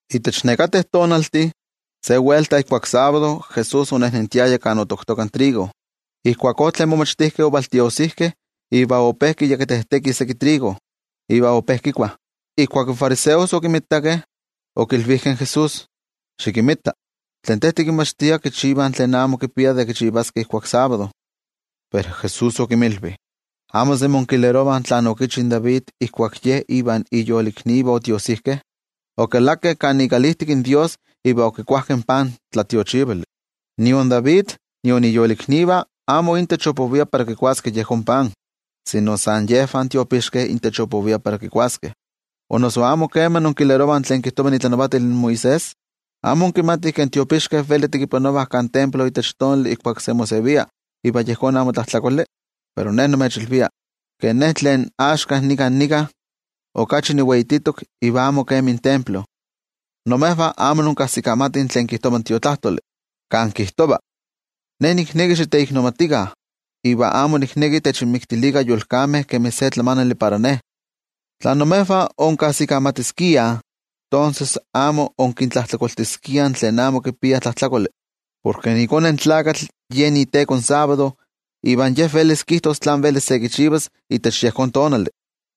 Itech nekateh tonaltih, se welta ijkuak sábado, Jesús onejnentiaya kan otoktoka trigo. Ijkuakó, in momachtijkeh otiojsijkeh iva ope kikuakojkotonah seki trigo, iva ope kikuah. Ijkuak in fariseos okimitakeh, okilvijkeh in Jesús: —Xikinmita, tlen Te tikinmachtia kichivah tlen amo kipia de kichivaskeh ijkuak sábado. Pero Jesús okinmilvi: —¿Amo semi inkilerovah tlen okichi in David ijkuak ye ivan iyoliknivah otiojsijkeh? Okalakeh kan ikalijtik in Dios iva okikuajkeh in pan tlatiochivali. Nion David nion iyoliknivah amo intech opovia para kikuaskeh yejón pan, sino san yejvah tiopixkeh intech opovia para kikuaskeh. ¿O noso amo kema inkilerovah tlen kijtova itlanavatil Moisés? ¿Amo inkimatih ke in tiopixkeh veli tekipanovah kan templo ijkuak sábado iva yejón amo tlajtlakoli? Pero Ne nimechilvia, ke Ne tlen axka nikan nika, okachi niweititok iva amo kemi in templo. Imejvah amo inkajsikamatih tlen kijtova in Tiotlajkuiloli, kan kijtova: “Ne nikneki xiteiknomatikah iva amo nikneki techinmiktilikah yolkameh kemi se tlamanali para Ne.” Tla imejvah onkajsikamatiskiah, tonses amo onkintlajtlakoltiskiah tlen amo kipiah tlajtlakoli. Porke iKone in Tlakatl yen tekova de yejón sábado iva yen velis kijtos tlán velis se kichivas itech yejón tonali.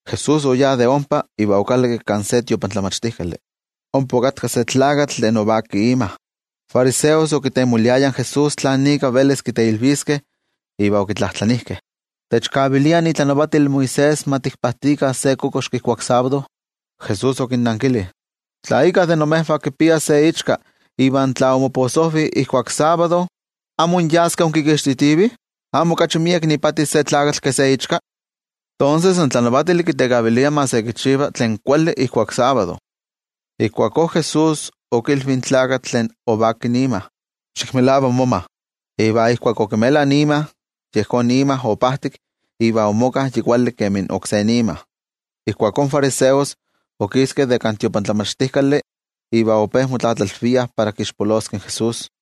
Jesús oyá de ompa iva okalakki kan se tiotlamachtijkali. Ompa okatka se tlakatl tlen ovaki ima. In fariseos okitemoliayah in Jesús tlán ika velis kiteilviskeh, iva okitlajtlanijkeh: —¿Techkavilia itlanavatil Moisés ma tikpajtikah se kokoxki ijkuak sábado? Jesús okinnankili: —Tla íkka de imejvah kipia se ichka iva tla omoposojvi ijkuak sábado, ¿amo inyaskeh inkixtitivih? ¿Amo okachi miek ipati se tlakatl ke se ichka? Tonses, in tlanavatili kitekavilia ma se kichiva tlen kuali ijkuak sábado. Ijkuakó Jesús okilvi in tlakatl tlen ovaki ima: —Xikmelava moma. Iva ijkuak okimela ima, yejón ima opajtik iva omoka yi kuali kemi oksé ima. Ijkuakó in fariseos okiskeh de kan tiotlamachtijkali, iva ope motlatlalviah para kixpoloskeh in Jesús.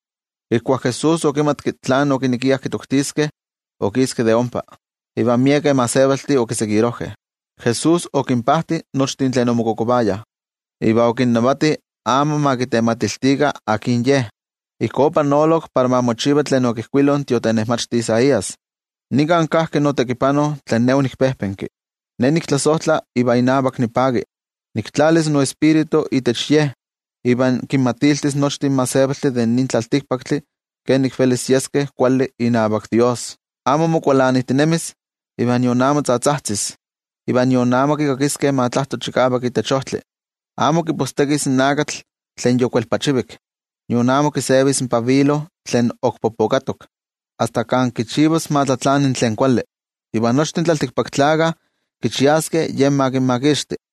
Ijkuak Jesús okimatki tlen okinekiah kitoktiskeh, okiski de ompa, iva miekeh gentejtih okitokakeh. Jesús okinpajti nochtin tlen omokokovayah, iva okinnavati amo ma kitematiltikah akin Ye. Ijkó opanolok para ma mochiva tlen okijkuilo in tiotenejmachti Isaías: Nikan kajki notekipano tlen Ne onikpejpenki, Ne niktlasojtla iva inavak nipaki. Niktlalis noTioijyotzi itech Ye, iva kinmatiltis nochtin gentejtih de nin tlaltikpaktli kenik velis yeskeh kuali inavak Dios. Amo mokualanijtinemis iva nion amo tzatzajtzis. Iva nion amo kikakiskeh ma tlajto chikavak itech ojtli. Amo kipostekis in akatl tlen yokuelpachivik, nion amo kisevis in pabilo tlen ok popokatok, asta kan kichivas ma tlatlani tlen kuali. Iva nochtin tlaltikpaktlakah kichiaskeh Ye ma kinmakixti.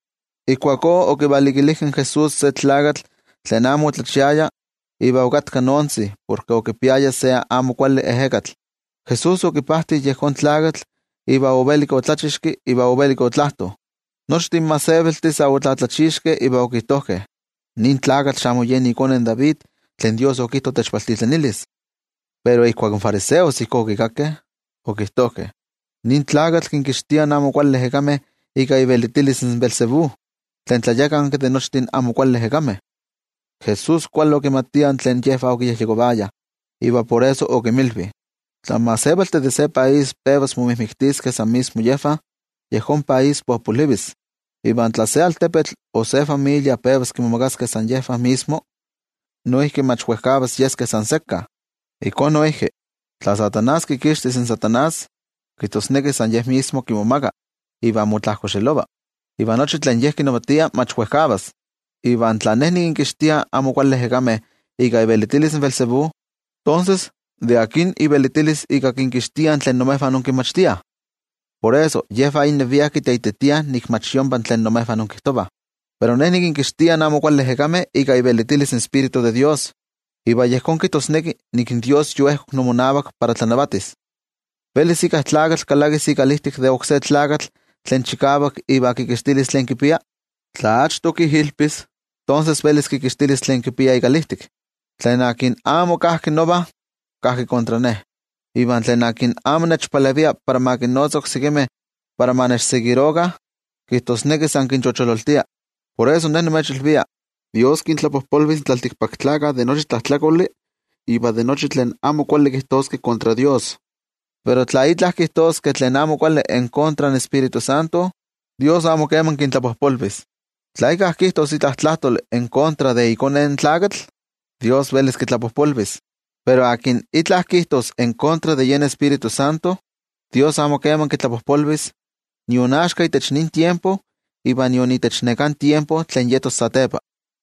Ijkuakó okivalikilijkeh in Jesús se tlakatl tlen amo otlachiaya iva okatka noontzi porke okipiaya se amo kuali ejekatl. Jesús okipajti yejón tlakatl iva ovelik otlachixki iva ovelik otlajto. Nochtin gentejtih sa otlatlachixkeh iva okijtojkeh: —¿Nin tlakatl xamo yen ikone David tlen Dios okijto techvaltitlanilis? Pero ijkuak in fariseos ijkó okikakkeh, okijtojkeh: —Nin tlakatl kinkixtia amo kuali ejekameh ika ivelitilis Beelzebú, tlen tlayakanki de nochtin amo kuali ejekameh. Jesús kuali okimatia tlen yejvah okiyejyekovayah, iva por eso okinmilvi: —Tla in gentejtih de se país pevas momijmiktiskeh san mismo yejvah, yejón país popolivis. Iva tla se altepetl o se familia pevas kimomagaskeh san mismo yejvah, noijki mach wejkavas yeskeh san sekka. Ijkó noijki, tla in Amo Kuali Tlakatl kikixtis in Amo Kuali Tlakatl, kijtosneki san ye mismo kimomaga ivan motlajkoxelova, iva nochi tlen ye kinavatia mach wejkavas. Iva tla Ne nikinkixtia amo kuali ejekameh ika ivelitilis Beelzebú, tonses ¿de akin ivelitilis ika kinkixtiah tlen imejvah inkinmachtiah? Por eso, yejvah innevia kiteititiah nik mach yompa tlen imejvah inkijtovah. Pero Ne nikinkixtia amo kuali ejekameh ika Dios iTioijyotzi, iva yejón kijtosneki nik in Dios yoejkok imonavak para tlanavatis. ’¿Velis íkka tlakatl kalakis ikalijtik de oksé tlakatl tlen chikavak iva kikixtilis tlen kipia? Tla achto kijilpis, tonses velis kikixtilis tlen kipia ikalijtik. ’Tlen amo kajki nova, kajki kontra Ne. Iva tlen amo nechpalevia para kinnotzas oksekimeh para ma nechseguirokah, kijtosneki san kinchochololtia. ’Por eso nimechilvia, Dios kintlapojpolvis in tlaltikpaktlakah de nochi tlajtlakoli iva de nochi in fiero tlen kijtoskeh kontra Dios, pero tla itla kijtoskeh tlen amo kuali en kontra de yen Tioijyotzintli, Dios amo keman kintlapojpolvis. Tla íkka kijtos itla tlajtoli en kontra de iKone in Tlakatl, Dios velis kitlapojpolvis, pero akin itla kijtos en kontra de yen Tioijyotzintli, Dios amo kitlapojpolvis, nion axka itech nin tiempo iva nion itech neká tiempo tlen yetos satepa.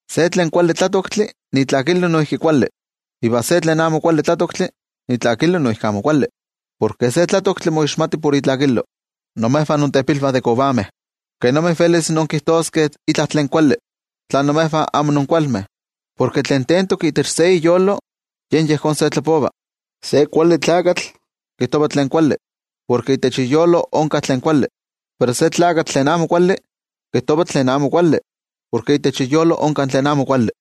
’Se tlen kuali kuavitl, itlakilo noijki kuali. Iva se tlen amo kuali kuavitl, itlakilo noijki amo kuali. Porke se kuavitl moixmati por itlakilo. ¡Imejvah intepilvah de kovameh! ¿Kenomi velis inkijtoskeh itla tlen kuali, tla imejvah amo inkualmeh? Porke tlen tentok itech se iyolo, yen yejón se tlapova. Se kuali tlakatl, kijtova tlen kuali, porke itech iyolo onka tlen kuali. Pero se tlakatl tlen amo kuali kijtova tlen amo kuali, porke itech iyolo onka tlen amo kuali.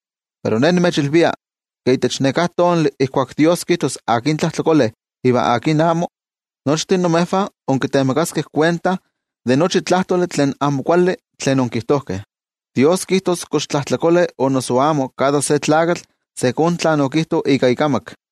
Pero Ne nimechilvia ke itech neká tonali ijkuak Dios kijtos akin tlajtlakole iva akin amo, nochtin imejvah inkitemakaskeh kuenta de nochi tlajtoli tlen amo kuali tlen onkijtojkeh. Dios kijtos kox tlajtlakole o noso amo kada se tlakatl ijkó kemi tlen okijto ika ikamak.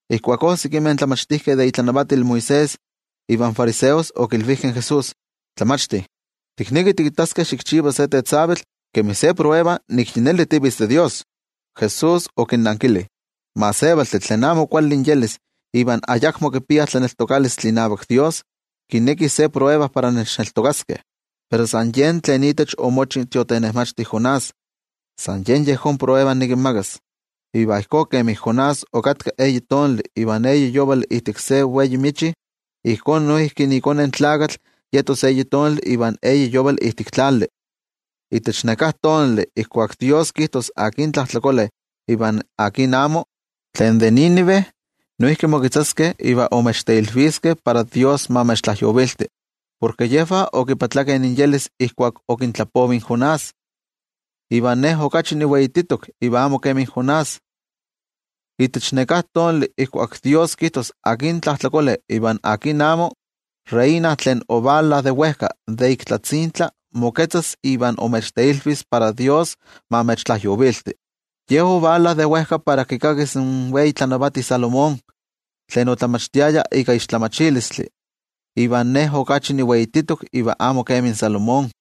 Ijkuakó sekimeh tlamachtijkeh de itlanavatil Moisés ivan fariseos okilvijkeh in Jesús: —Tlamachti, tiknekih tikittaskeh xikchiva se tetzavkaneskayotl tlen ma kinexti nik yi neli tivitz de Dios. Jesús okinnankili: —In gentejtih tlen amo kuali inyelis iva ayakmo kipiah tlaneltokalistli inavak Dios, kinekih ma nikinmititi se tetzavkaneskayotl para nechneltokaskeh. Pero san yen tlen itech omochi in tiotenejmachti Jonás, san yen yejón tetzavkaneskayotl nikinmakas. Iva ijkó kemi Jonás okatka eyi tonali iva eyi yovali ijtik se wei michi, ijkó noijki iKone in Tlakatl yetos eyi tonali iva eyi yovali ijtik tlali. Itech neká tonali ijkuak Dios kijtos akin tlajtlakole iva akin amo, tlen de Nínive noijki moketzaskeh iva imechteilviskeh para Dios ma imechtlajyovilti. Porke yejvah omoyolkuapkeh ijkuak okintlapovi in Jonás, iva Ne okachi niweititok iva amo kemi Jonás. Itech neká tonali ijkuak Dios kijtos akin tlajtlakole iva akin amo, in reina tlen ovala de wejka de ik tlatzintla moketzas iva imechteilvis para Dios ma imechtlajyovilti. Ye ovala de wejka para kikakis in wei tlanavati Salomón tlen otlamachtiaya ika tlamatilistli, iva Ne okachi niweititok iva amo kemi Salomón.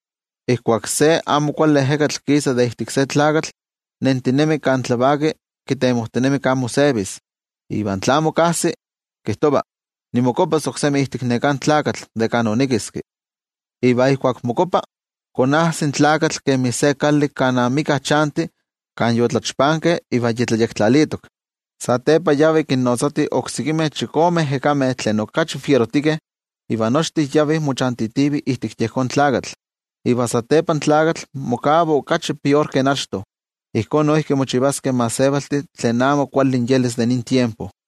’Ijkuak se amo kuali ejekatl kisa de ijtik se tlakatl, nentinemi kan tlavaki kitemojtinemi kan mosevis, iva tla amo kajsi, kijtova: “Nimokuapas oksemi ijtik neká tlakatl de kan onikiski.” Iva ijkuak mokuapa, konajsi in tlakatl kemi se kali kan amika chanti, kan yotlachpankeh iva yi tlayektlalitok. Satepa yavi kinnotzati oksekimeh chikome ejekameh tlen okachi fierotikeh, iva nochtin yavih mochantitivih ijtik yejón tlakatl, iva satepa in tlakatl mokava okachi pior ke achto. Ijkó noijki mochivaskeh in gentejtih tlen amo kuali inyelis de nin tiempo.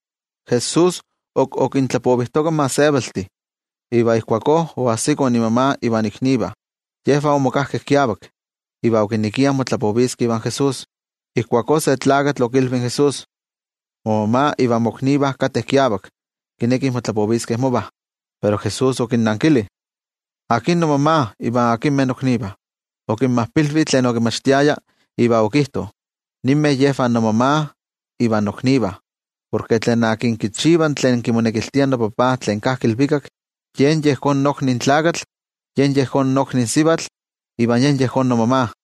Jesús ok okintlapovijtoka in gentejtih, iva ijkuakó oajsikoh imama ivan iknivah. Yejvah omokajkeh kiavak, iva okinekiah motlapoviskeh ivan Jesús. Ijkuakó se tlakatl okilvi in Jesús: —Momama ivan moknivah kateh kiavak, kinekih motlapoviskeh mova. Pero Jesús okinankili: —¿Akin nomama, iva akinmeh noknivah? Okinmajpilvi tlen okinmachtiaya iva okijto: —Ninmeh yejvah nomama iva noknivah. Porke tlen kichiva tlen kimonekiltia noTajtzi tlen kajki ilvikak, yen yejón nokni tlakatl, yen yejón nokni sivatl iva yen yejón nomama.